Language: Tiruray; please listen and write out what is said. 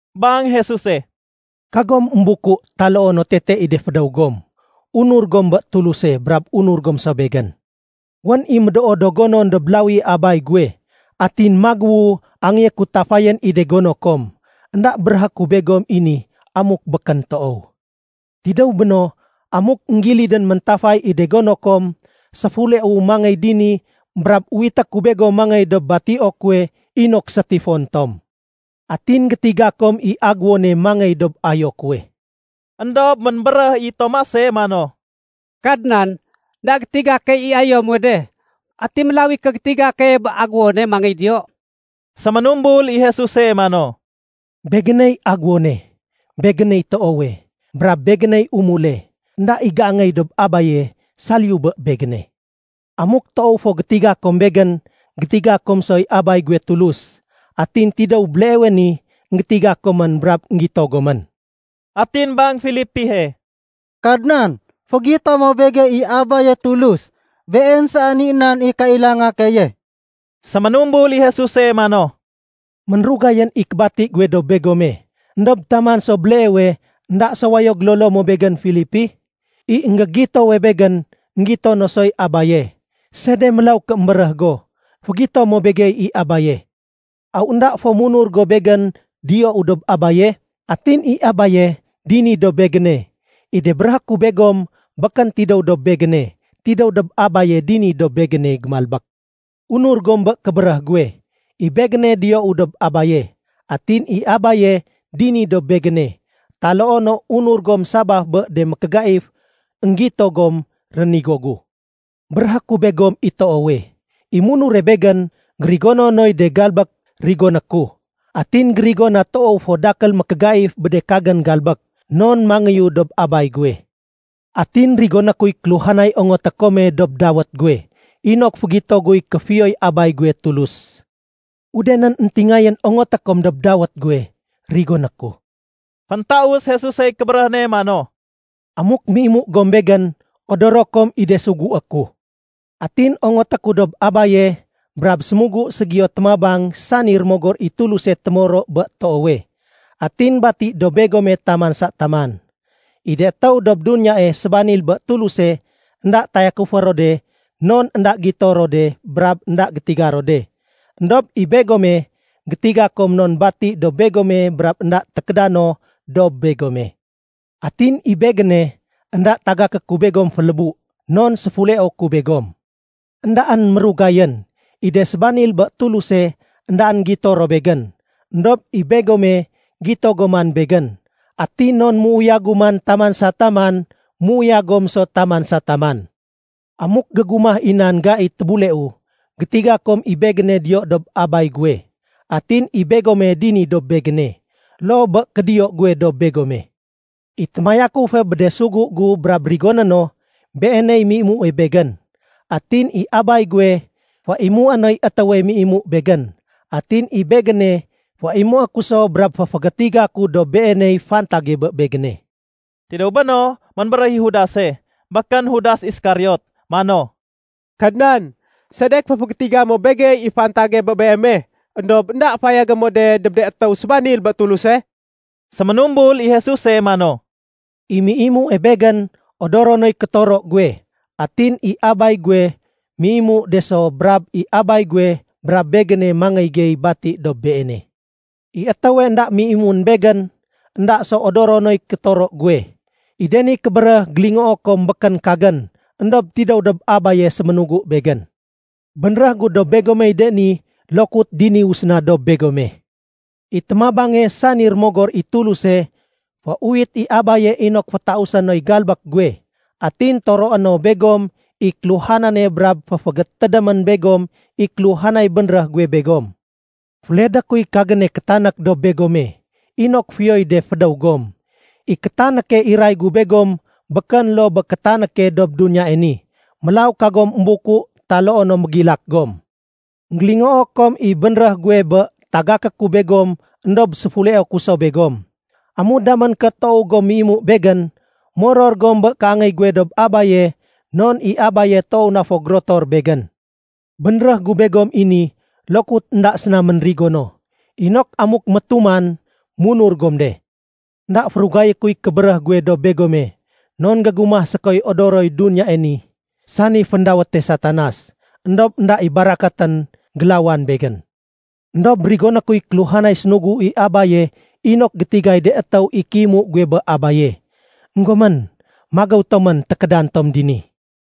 Bang Jesuse, “Kagom émbuku taloo no tete i de fédéw gom. Unur gom bé Tuluse, brab unur gom so Begén. Wén i médoo do gonon dob lawi i Abay guwe. Atin magéwu angéyé ku tafayén i de gono kom. Enda béréhé ku begom i ni amuk békén toow. Tidéw béno, amuk énggilidén méntafay i de gono kom, séfuleu mangéy dini brab uwité ku begom mangéy dob batio kuwe inok sétifon tom. Atin gétiga kom i agéwone mangéy dob ayo kuwe.” Endob ménbéréh i Tomase mano, “Kadnan, énda gétiga key i ayo muwe de. Ati mélaw i kégétiga keye bé agéwone mangéy diyo?” Séménumbul i Jesuse mano, “Begéney agéwone, Begéney toowe, brab Begéney umule. Enda i géangéy dob Abaye saliyu bé Begéne. Amuk toow fo gétiga kom Begén, gétiga kom soy Abay guwe Tulus. Atin tidéw béleewe ni, énggétiga komén brab énggito gomén.” Atin bang Filipihe. “Kadnan, fégito mo begey i Abaye Tulus. Been saén i nan i kailanga keye.” Séménumbul i Jesuse mano, “Ménrugayén i kébati guwe dob begome. Endob taman so béleewe énda so wayo gélolo mo Begén Filipi? I énggégitowe Begén, énggito no soy Abaye. Sede mélaw ké émbéréh go, ‘Fégito mo begey i Abaye’? Aw énda fo munur go Begén diyou dob Abaye, atin i Abaye dini dob Begéne? I de béréhé ku begom békén tidéw dob Begéne. Tidéw dob Abaye dini dob Begéne gémalbék. Unur gom bé kébéréh guwe, i Begéne diyou dob Abaye, atin i Abaye dini dob Begéne. Taloo no unur gom sabaf bé de mékégaif énggito gom rénigo gu. Béréhé ku begom i toowe, i munure Begén gérigono noy de galbék rigoné ku. Atin gérigo na toow fo dakél mékégaif bé de kagén galbék, non mangéyu dob Abay guwe. Atin rigoné kuy kéluhanay ongoté kome dob dawét guwe, inok fégito guy kéfiyoy Abay guwe Tulus. Udenén éntingayén ongoté kom dob dawét guwe, rigoné ku.” Féntaus Jesusey kébéréh ne mano, “Amuk méimu gom Begén, odoro kom i de sugué ku. Atin ongoté ku dob Abaye, brab sémugu ségiyo témabang sani Rémogor i Tuluse témoro bé toowe. Atin bati dob begome taman sa taman. I de étéw dob duniyae sébanil bé Tuluse énda tayakufé ro de non énda gito ro de brab énda gétiga ro de. Endob i begome, gétiga kom non bati dob begome brab énda tékéda no dob begome. “Atin i Begéne, énda tagaké ku begom félébu, non séfuleo ku begom. Endaén mérugayén, i de sébanil bé Tuluse éndaén gito ro Begén. Endob i begome, gito gom man Begén. Atin non méuyagu man taman sa taman, méuyag gom so taman sa taman. Amuk gégumah i nan gai tébuleu, gétiga kom i Begéne diyo dob Abay guwe, atin i begome dini dob Begéne, loo bé kédiyo guwe dob begome. “I témayakufe bé de sugu gu brab rigoné no, beeney méimue Begén. Atin i Abay guwe féimué noy étéwe méimu Begén. Atin i Begéne féimué ku so brab féfégétiga ku dob beeney fantage bé Begéne.” Tidéw béno, ménbéréh i Judase (békén Judas Iskariot) mano, “Kadnan, sedek féfégétiga mo begey i fantage bé Beeme, éndob énda fayagé mo de dob de étéw sébanil bé Tuluse?” Séménumbul i Jesuse mano, “I méimue Begén, odoro noy kétoro guwe. Atin i Abay guwe méimu de so brab i Abay guwe brab Begéne mangéy gey bati dob beene. I étéwe énda méimuén Begén, énda so odoro noy kétoro guwe. I de ni kébéréh gélingoo kom békén kagén, éndob tidéw dob Abaye séménugu Begén. “Bénréh gu dob begomey de ni lokut diniwu séna dob begome. I témabange sani Rémogor i Tuluse, féuwit i Abaye inok fétausé noy galbék guwe. Atin toroé no begom i kéluhanane brab féfégétédémén begom i kéluhanay bénréh guwe begom. “Féledé kuy kagéne kétanék dob begome, inok fiyoy de fédéw gom. I kétanéke iray gu begom békén loo bé kétanéke dob duniyae ni. Mélaw kagom émbuku taloo no mégilak gom. Enggélingoo kom i bénréh guwe bé tagaké ku begom éndob séfuleo ku so begom. Amu damén ké toow gom méimu Begén, moror gom bé kéangéy guwe dob Abaye non i Abaye toow na fo gérotor Begén. Bénréh gu begom i ni lokut énda séna ménrigo no, inok amuk métuman, munur gom de. Enda férugayé kuy kébéréh guwe dob begome non gégumah sékoy odoroy duniyae ni sani féndawéte Satanas. Endob énda i barakatén gélawan Begén. Endob rigoné kuy kéluhanay sénugu i Abaye inok gétigay de étéw i kéimu guwe bé Abaye. Enggomén, magéw tomén tékédan tom dini.”